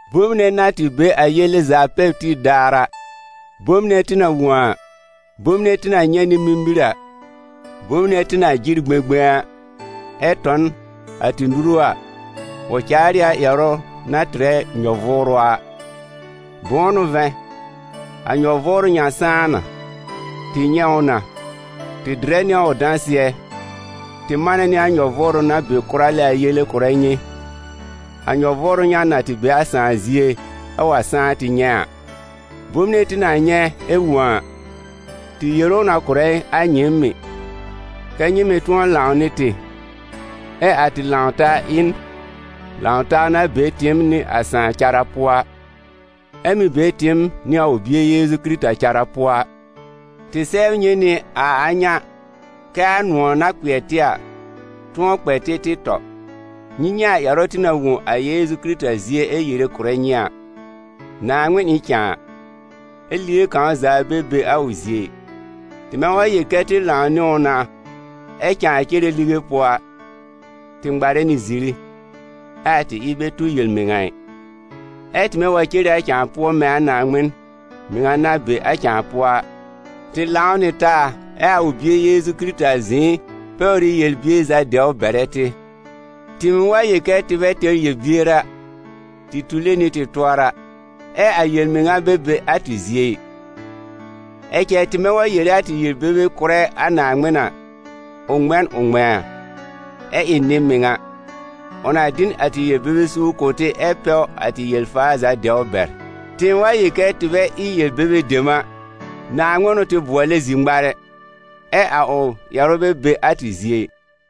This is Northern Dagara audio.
Bom nɛ na tɩ be a Yele za pɛr tib daar a, bom nɛ tɩ na wõ a, bom nɛ tɩ na nyɛ̃ nɩ mimir a, bom nɛ tɩ na jɩr gbẽgbẽ a, ɛ tɔ n a tɩ nuru a, ʋ caar ɩ a ƴɛrʋ na tɩrɛ nyɔ-vʋʋrʋ a. Bʋ̃ʋ n'ʋ vɛ̃, a nyɔ-vʋʋrʋ ŋa sãá na, tɩ nyɛ̃ ʋ na, tɩ dɩrɛ nɩ a ʋ dãsɩɛ, tɩ manɛ nɩ a nyɔ-vʋʋrʋ na be kʋra lɛ a yele kʋ̀rɛ nyɩ, a nyɔ-vʋʋrʋ ŋa na tɩ be a Sãà zie ɛ wa sãá tɩ nyɛ̃ a. Bom nɛ tɩ na nyɛ̃ ɛ wõ a, tɩ yere ʋ na kʋ̀rɛ a nyɩɩm mɩ̀, kɛ́ nyɩ mɩ̀ tʋ̃ɔ lãw nɩ tɩ, ɛ a tɩ lãw-taa ɩ n lãw-taa na be tɩɩm nɩ a Sãà cara pʋɔ, ɛ be tɩɩm nɩ a ʋ Bie Yeezu Kɩrɩta cara pʋɔ a. Tɩ sɛbr nyɩ nɩ a a ŋa kɛ a nʋ̃ɔ̀ na kpɩɛr tɩ a, tʋ̃ɔ kpɛ tɩ tɩ tɔ. Nyɩ nyɛ̃ a ƴɛrʋ tɩ na wõ a Yeezu Kɩrɩta zie ɛ yere kʋ̀rɛ nyɩ a: Naaŋmɩn ɩ n cãa, ɛ lige kãw za bɛ be a ʋ zie ɩ. Tɩmɛ wa yel kɛ tɩ lãw nɩ ʋ na ɛ cãa cere lige pʋɔ a, tɩ ŋmarɛ nɩ ziri, ɛ a tɩ ɩb bɛ tu yel-mɩŋa ɩ. Ɛ tɩmɛ wa cere a cãa pʋɔ mɛ̃ a Naaŋmɩn mɩŋa na be a cãa pʋɔ a, tɩ lãw nɩ taa ɛ a ʋ Bie Yeezu Kɩrɩta zɩ̃ɩ pɛwr ɩ yel-bier za dɛwr bɛrɛ tɩ. Tɩɩm wa yel kɛ tɩ bɛ tɛr yel-bier a, tɩ tule nɩ tɩ tʋɔra, ɛ a yel-mɩŋa bɛ be a tɩ zie ɩ. Ɛ cɛ tɩmɛ wa yere a tɩ yel-bebe kʋ̀rɛ a Naaŋmɩn a, ʋ ŋmɛ̃ n ʋ ŋmɛ̃a, ɛ ɩ nɩ-mɩŋa, ʋ na dɩ n a tɩ yel-bebe suur kʋ̀ tɩ ɛ pɛw a tɩ yel-faar za dɛwr bɛr. Tɩɩm wa yel kɛ tɩ bɛ ɩ yel-bebe dem a, Naaŋmɩn n'ʋ tɩ bʋɔlɛ zir-ŋmarɛ, ɛ a ʋ ƴɛrʋ bɛ be a tɩ zie ɩ.